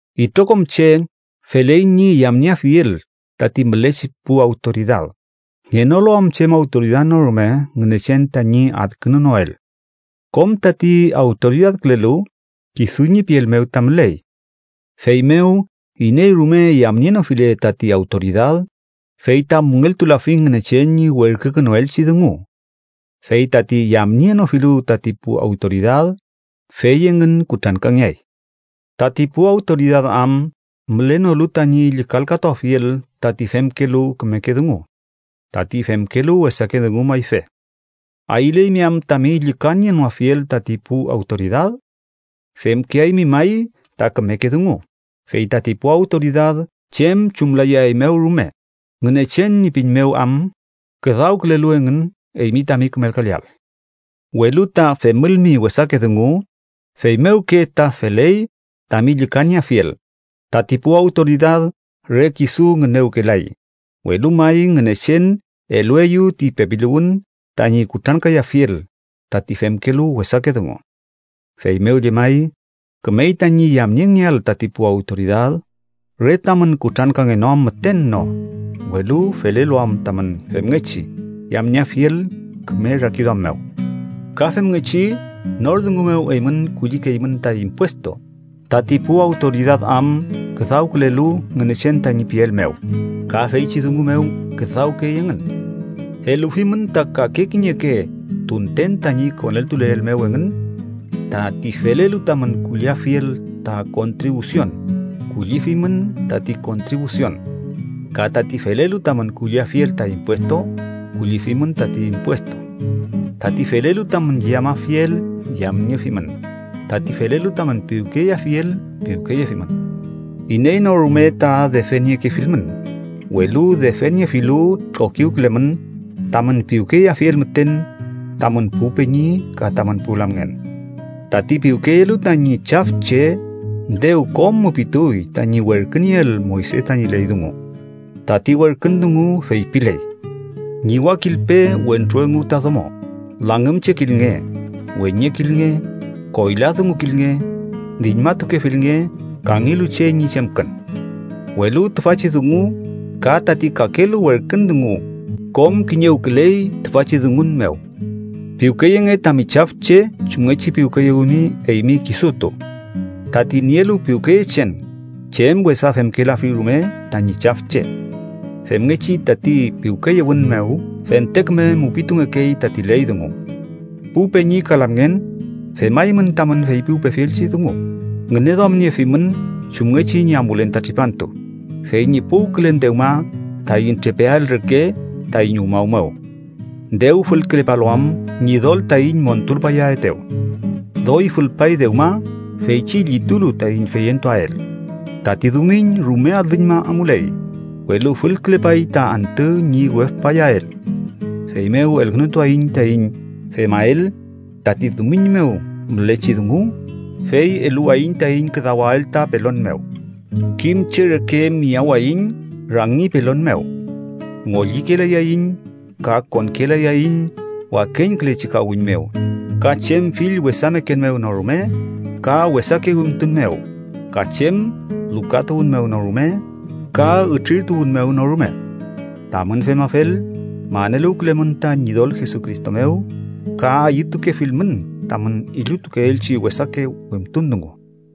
Itrokom che feley ñi yamnieafiel tati mülechi pu awtoridad, ngenoluam chem awtoridad no rume Ngünechen tañi adkünunoel. Kom tati awtoridadkülelu, kisu ñi piel mew ta müley. Feymew iney rume yamnienofile tati awtoridad, fey ta müngeltulafi Ngünechen ñi werkükünuelchi dungu. Fey tati yamnienofilu tati pu awtoridad, fey engün kutrankangeay. Tati pu awtoridad am mülenolu tañi llükalkatuafiel tati femkelu kümeke dungu, tati femkelu wesake dungu mayfe. ¿Ayüleymi am tami llükanienoafiel tati pu awtoridad? Femkeaymi may ta kümeke dungu, fey tati pu awtoridad chem chumlayaeymew rume, Ngünechen ñi pin mew am küdawkülelu engün eymi tami kümelkaleael. Welu ta femülmi wesake dungu, feymewke ta feley tami llükanieafiel. Tati pu awtoridad re kisu ngünewkelay, welu may Ngünechen elueyew ti pepiluwün tañi kutrankayafiel tati femkelu wesake dungu. Feymew llemay, kümey tañi yamniengeael tati pu awtoridad, re tamün kutrankangenoam müten no, welu felelu am tamün femngechi yamnieafiel küme rakiduam mew. Ka femngechi nor dungu mew eymün kullikeymün ta impuestu, tati pu awtoridad am küdawkülelu Ngünechen tañi piel mew, ka feychi dungu mew küdawkey engün. Elufimün ta kake kiñeke tunten tañi koneltuleel mew engün. Tati felelu tamün kulliafiel ta kontribusion, kullifimün tati kontribusion. Ka tati felelu tamün kulliafiel ta impuestu, kullifimün tati impuestu. Tati felelu tamün yamafiel, yamniefimün. Tati felelu tamün piwkeyeafiel, piwkeyefimün. Iney no rume ta defeniekefilmün, welu defeniefilu trokiwkülemün tamün piwkeyeafiel müten tamün pu peñi ka tamün pu lamngen. Tati piwkeyelu tañi chafche dew kom mupituy tañi werkünieel Moyse tañi ley dungu. Tati werkün dungu feypiley: “Ñiwakilpe wentru engu ta domo, langümchekilnge, weñekilnge, koyladungukilnge, diñmatukefilnge kangelu che ñi chemkün”, welu tüfachi dungu ka tati kakelu werkün dungu kom kiñewküley tüfachi dungun mew: “Piwkeyenge tami chafche chumngechi piwkeyewimi eymi kisutu.” Tati nielu piwkeyechen, chem wesa femkelafi rume tañi chafche. Femngechi tati piwkeyewün mew fente küme mupitungekey tati ley dungu. Pu peñi ka lamngen, femaymün tamün feypiwpefielchi dungu, ngüneduamniefimün chumngechi ñi amulen ta tripantu, fey ñi puwkülen dewma taiñ trepeael reke taiñ umaw mew. Dew fülkülepalu am Ñidol taiñ montulpayaetew. Doy fülpay dewma feychi llitulu taiñ feyentuael. Tati dumiñ rume alüñma amuley, welu fülkülepay ta antü ñi wefpayael. Feymew elkünutuaiñ taiñ femael tati dumiñ mew mülechi dungu, fey eluwayiñ taiñ küdawael ta pelon mew. Kim che reke miyawaiñ rangi pelon mew. Ngollikelayaiñ ka konkelayaiñ wakeñkülechi kawiñ mew, ka chem fill wesameken mew no rume, ka wesake wimtun mew, ka chem lukatuwün mew no rume, ka ütrirtuwün mew no rume. Tamün femafel, maneluwkülemün ta Ñidol Jesucristo mew, ka ayütukefilmün tamün illutukeelchi wesake wimtun dungu.